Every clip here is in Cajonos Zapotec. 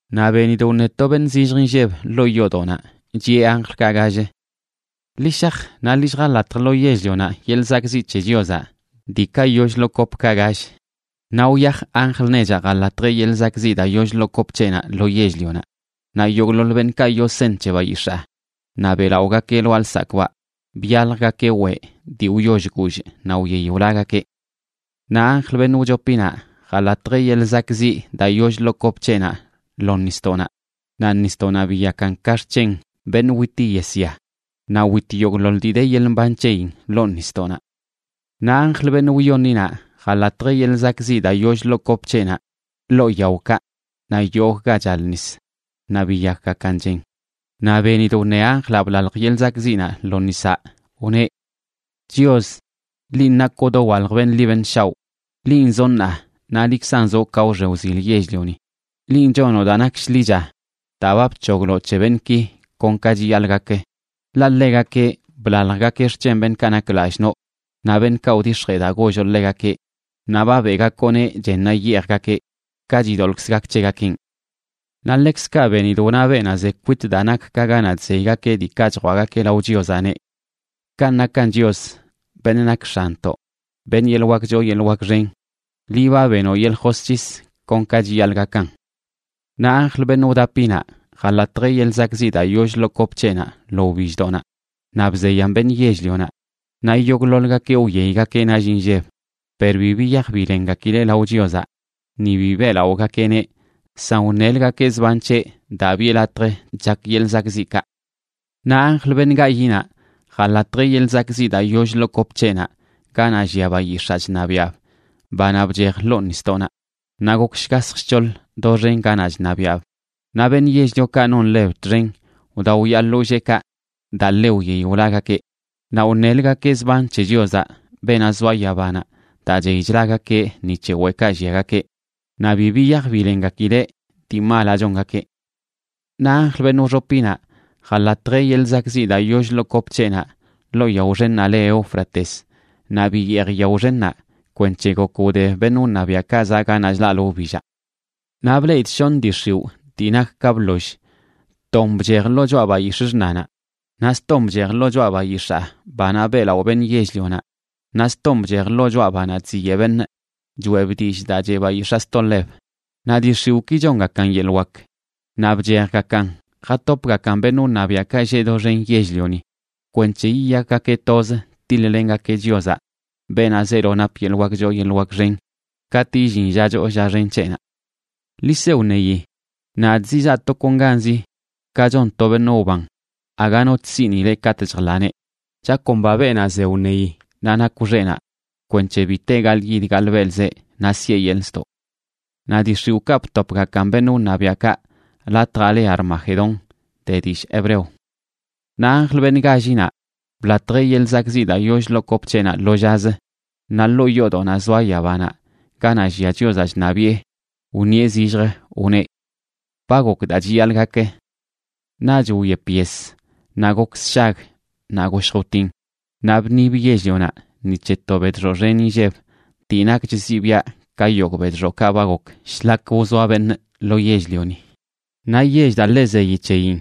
Naꞌ benidꞌ wṉe to beṉꞌ zillj inlleb ḻoo yoodoꞌnaꞌ, chiꞌe anjlkaꞌ gall: ―Ḻi shaj naꞌ ḻi lljalatj lo yell-lionaꞌ yeḻꞌ zakꞌziꞌ c̱he Chiozaꞌ diikaꞌ yoll ḻoo kopkaꞌ gall. Naꞌ wyaj anjl nechaꞌ, jalatjeꞌ yeḻꞌ zakꞌziꞌ daa yoll ḻoo kop c̱heꞌnaꞌ lo yell-lionaꞌ naꞌ yogꞌḻoḻ beṉꞌkaꞌ yoo seṉ c̱he bayix̱aa naꞌ beꞌlaꞌogakeꞌ lwaa lsakꞌbaꞌ byaljgakeꞌ weꞌ dii wyoll guullꞌ naꞌ wyey wlagakeꞌ. Naꞌ anjl, beṉꞌ wchopinaꞌ, jalatjeꞌ yeḻꞌ zakꞌziꞌ daa yoll ḻoo kop c̱heꞌnaꞌ lo nisdoꞌnaꞌ, naꞌ nisdoꞌnaꞌ biyakan ka xc̱hen beṉꞌ witi yesya, naꞌ wit yogꞌḻoḻ dii de yeḻꞌ mban c̱heyin ḻoo nisdoꞌnaꞌ. Naꞌ anjl, beṉꞌ wyoṉinaꞌ, jalatjeꞌ yeḻꞌ zakꞌziꞌ daa yoll ḻoo kop c̱heꞌnaꞌ ḻoo yaokaꞌ naꞌ yogꞌ ga chal nis, naꞌ biyakgakan chen. Naꞌ benidꞌ wṉe anjlaꞌ blalj yeḻꞌ zakꞌziꞌnaꞌ lo nisaꞌ, wneꞌ: ―Chios, linꞌ nakoꞌ dowalj beṉꞌ ḻi beṉꞌ shaoꞌ. Linꞌ zoꞌ ṉaa, naꞌ liꞌkzan zoꞌ ka wxe wzil yell-lioni. Linꞌ chonoꞌ daa nak shḻicha daa ba bc̱hogloꞌ c̱he beṉꞌki kon ka chiyaḻꞌ gak. Ḻaꞌ ḻegakeꞌ blaljgakeꞌ xc̱hen beṉꞌkaꞌ nak lallꞌ noꞌ naꞌ beṉꞌkaꞌ wdix̱jee daa golloꞌ ḻegakeꞌ, naꞌ ba beꞌgakoꞌneꞌ chennaꞌ yeejgakeꞌ, ka chidoḻꞌkzə gak c̱hegakeꞌn. Naꞌ ḻekzkaꞌ benidꞌ wna beenaꞌ ze kwit daa nak ka ganaꞌ chzeygakeꞌ diikaꞌ chjwaꞌgakeꞌ lao Chiozaꞌ, neꞌ: ―Kanꞌ nakan Chios, beṉꞌ nak X̱anntoꞌ, beṉꞌ yeḻꞌ wak choo yeḻꞌ wak xen, liꞌ ba benoꞌ yeḻꞌ josc̱his kon ka chiyaḻꞌ gakan. Naꞌ anjl, beṉꞌ wdapinaꞌ, jalatjeꞌ yeḻꞌ zakꞌziꞌ daa yoll ḻoo kop c̱heꞌnaꞌ lo wbilldoꞌnaꞌ, naꞌ bzeyan beṉꞌ yell-lionaꞌ. Naꞌ yogꞌḻoḻgakeꞌ wyeygakeꞌ nall inlleb. Per bi biyaj bilengakileꞌ lao Chiozaꞌ, ni bi beꞌlaꞌogakeꞌneꞌ, san wṉelgakeꞌ zban c̱heꞌ daa biꞌe latj chak yeḻꞌ zakꞌziꞌkaꞌ. Naꞌ anjl, beṉꞌ gayiꞌnaꞌ, jalatjeꞌ yeḻꞌ zakꞌziꞌ daa yoll ḻoo kop c̱heꞌnaꞌ ganaꞌ llia bayix̱aa chṉabiaꞌb, banaꞌ bchej ḻoo nisdoꞌnaꞌ, naꞌ gok shgasj shc̱hoḻ doxen ganaꞌ chṉabiaꞌb. Naꞌ beṉꞌ yell-liokaꞌ non ḻeb txen wdaoyaa ḻolleekaꞌ daa ḻe wyey wlagakeꞌ. Naꞌ wṉelgakeꞌ zban c̱he Chiozaꞌ, beenaꞌ zoa yabanaꞌ, daa chey chlagakeꞌ ni c̱he weꞌkaꞌ lliagakeꞌ, naꞌ bi biyaj bilengakileꞌ dii malaꞌ chongakeꞌ. Naꞌ anjl, beṉꞌ wxopinaꞌ, jalatjeꞌ yeḻꞌ zakꞌziꞌ daa yoll ḻoo kop c̱heꞌnaꞌ ḻoo yao xennaꞌ le Éufrates, naꞌ biyeej yao xennaꞌ kwenc̱he gok wde beṉꞌ wṉabiaꞌkaꞌ zaꞌ ganaꞌ chlaꞌlə wbillaꞌ. Naꞌ bleꞌidꞌ shoṉ dii x̱iwꞌ dii nak ka bḻoll. Ton bchej ḻoo choꞌa bayix̱ꞌ xṉanaꞌ, naꞌ ston bchej lo choꞌa bayix̱aa banaꞌ beꞌlaꞌo beṉꞌ yell-lionaꞌ, naꞌ ston bchej ḻoo choꞌa banaꞌ chziyeꞌ beṉꞌ, choꞌeb dillꞌ daa cheꞌ bayix̱aa sto ḻeb. Naꞌ dii x̱iwꞌki chongakan yeḻꞌ wak. Naꞌ bchejgakan jatopgakan beṉꞌ wṉabiaꞌkaꞌ lleꞌ doxen yell-lioni kwenc̱he yiyakgakeꞌ toz tiḻ-lengakeꞌ Chiozaꞌ, beenaꞌ zeelo nap yeḻꞌ wak choo yeḻꞌ wak xen, katꞌ illin lla choo lla xen c̱heꞌnaꞌ. “Ḻi se wṉeyi, nadꞌ zizaa tokonganzi, ka chon to beṉꞌ wban aga no chsiꞌnileꞌ katꞌ chjḻaneꞌ. Chakomba beenaꞌ ze wṉeyi naꞌ nakw xeꞌnaꞌ kwenc̱he bi te gaḻꞌyid gaḻꞌbelꞌzeꞌ naꞌ siꞌe yeḻꞌ ztoꞌ.” Naꞌ dii x̱iwꞌkaꞌ btopgakan beṉꞌ wṉabiaꞌkaꞌ latjaꞌ le Armagedón de dillꞌ hebreo. Naꞌ anjl, beṉꞌ gállinaꞌ, blatjeꞌ yeḻꞌ zakꞌziꞌ daa yoll ḻoo kop c̱heꞌnaꞌ lo llazə. Naꞌ ḻoo yoodoꞌnaꞌ zoa yabanaꞌ, ganaꞌ llia Chiozaꞌ chṉabiꞌe, wṉieꞌ zillj, wneꞌ: ―Ba gok daa chiyaḻꞌ gak. Naꞌch wyep yes, naꞌ gok sshag, naꞌ goshj wtin, naꞌ bṉib yell-lionaꞌ ni c̱he to bedxoꞌ xen inlleb dii nakch zibiaꞌ ka yogꞌ bedxoꞌkaꞌ ba gok shlak wzoa beṉꞌ lo yell-lioni. Naꞌ yell daa ḻe zeyi c̱heyin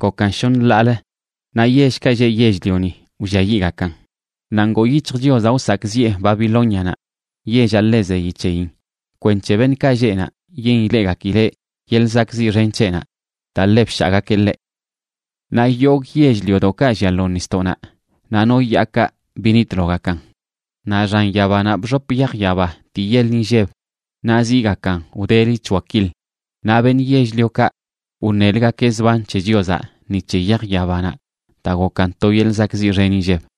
gokan shoṉ ḻaalə, naꞌ yellkaꞌ lleꞌ yell-lioni wlliayiꞌgakan. Naꞌ ngoo yic̱hj Chiozaꞌ wsakꞌziꞌe Babilónianaꞌ, yellaꞌ ḻe zeyi c̱heyin, kwenc̱he beṉꞌkaꞌ lleꞌ naꞌ yen ileꞌgakileꞌ yeḻꞌ zakꞌziꞌ xen c̱heꞌnaꞌ daa ḻe bshaagakeꞌ ḻeꞌ. Naꞌ yogꞌ yell-liodoꞌkaꞌ llia lo nisdoꞌnaꞌ naꞌ no yaakaꞌ binitlogakan. Naꞌ xan yabanaꞌ bxop yaj yaba dii yeḻ inlleb naꞌ ziigakan wdeli c̱hoa kil. Naꞌ beṉꞌ yell-liokaꞌ wṉelgakeꞌ zban c̱he Chiozaꞌ ni c̱he yaj yabanaꞌ daa gokan to yeḻꞌ zakꞌziꞌ xen inlleb.